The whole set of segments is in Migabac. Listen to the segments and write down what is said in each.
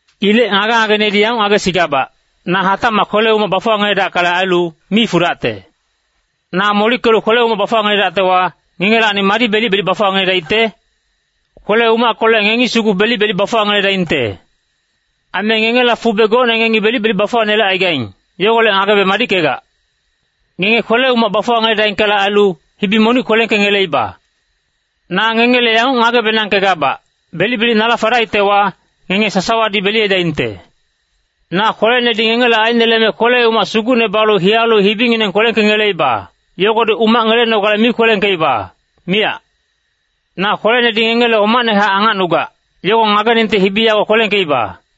Ilec ngage-ngagenedi yanguc ngagesigabac, na hatacmac kwele-umac bafuwangeledackale ailu, mi fudacte. Na molickelu kwele-umac bafuwangeledactewa, ngengelacni madi belic-belic bafuwaneledaicte? Kwele-umackolec ngengi sugu belic-belic bafuwaneledaingte. Aime ngengela fube gocne ngengi belic-belic bafuwanelecaigaing, yogolec ngagebe madickegac. Ngenge kwele-umac bafuwangeledackale ailu, hibi monic kwelengkengeleiba. Na ngengele yanguc ngage-benangkegabac, belic-belic nala fadaictewa, ngenge sasawadi beliyedaingte. Na kwelenedi ngengele aineleme kwele-umac sugucne balu hiyalu hibingineng kwelengkengeleiba, yogodi umac ngelenogale mi kwelengkeiba, miyac. Na kwelenedi ngengele homacnehac angacnugac, yogo ngageningte hibi yogo kwelengkeiba.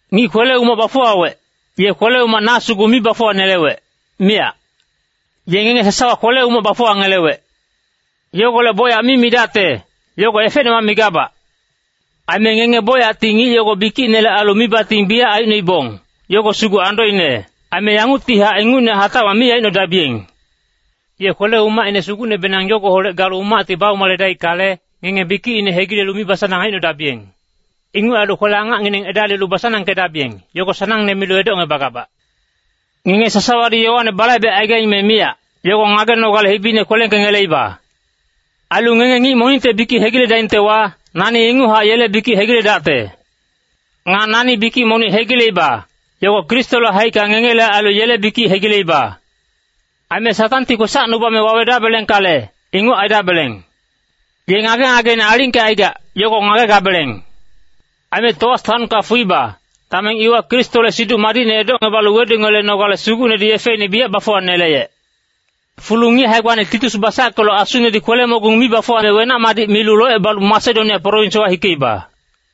Ngic kwele-umac bafuwawec, ye kwele-umac na sugu mi bafuwanelewec, miyac. Ye ngenge sasawa kwele-umac bafuwangelewec. Yogolec bocyac mi midacte, yogo efecnemac migabac. Aime ngenge bocyacti ngic yogo bikicinele ailu mibating biyac aicnoibong, yogo sugu andoine. Aime yanguctihac ingucne hatacmac mi aicnodabiyeng. Ye kwele-umacine sugucnebenang yogoholec galu umacti baumaledaickale, ngenge bikicine hegilelu mibasanang aicnodabiyeng. Inguc ailu kwele-angacngineng edalilu basanangkedabiyeng, yogo sanangne milu edocngebagabac. Ngenge sasawadi yowane balaibecaigaing me miyac, yogo ngagenogale hibine kwelengkengeleiba. Ailu ngenge ngic monicte bikic hegiledaingtewa, nani inguchac yele bikic hegiledacte. Nga nani bikic monic hegileiba, yogo Kristole haicka ngengele ailu yele bikic hegileiba. Aime Satangti kwesacnubame wawedabelengkale, inguc aidabeleng. Ye ngage-ngageine alingkecaigac, yogo ngagegabeleng. Aime Toas taonka fuiba, dameng iwa Kristole Siduc Madicne edocebalu weduyelenogale Sugucnedi yefeine biyac bafuwaneleyec. Fulu ngic hae-gbane Titus basackelu asunedi kwele-mogung mi bafuwame wenac-madic milu locebalu Masedonia prowinswa hikeiba.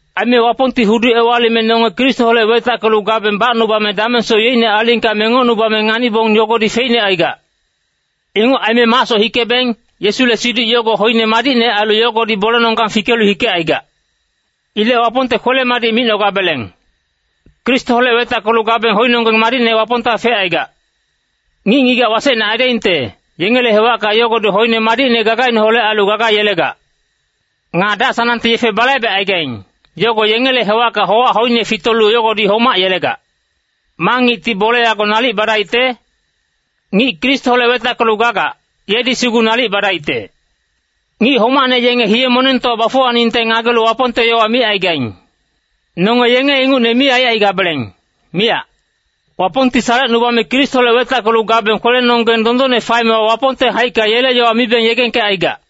Aime Wapongti hudu ewalime nonge Kristoholec wetackelu gabeng bacnubame damengsoc yeicne alingka mengocnubame nganibong yogodi feicne aigac. Inguc aime macsoc hikebeng, Yesule siduc yogo hoine madicne ailu yogodi bolenonggang fikelu hikecaigac. Ilec Wapongte kwele-madic micnogabeleng! Kristoholec wetackelu gabeng hoinonggeng madicne Wapongta fecaigac. Ngic-ngigac wasecne aidaingte, yengele hewacka yogodi hoine madicne gagaineholec ailu gaga yelegac. Nga dac-sanangte yefe balaibecaigaing, yogo yengele hewacka howac hoine fitolu yogodi homac yelegac. Ma ngicti bole yogo nalic badaicte? Ngic Kristoholec wetackelu gagac, yedi sugu nalic badaicte. Ngic homacne yenge hiye-monengtowa bafuwaningte ngagelu Wapongte yowa micaigaing. Nonge yenge ingucne mi aicaigabeleng, miyac. Wapongti salecnubame Kristoholec wetackelu gabeng kwelenonggeng dondonne faemewa Wapongte haicka yele yowa mibeng yegengkecaigac.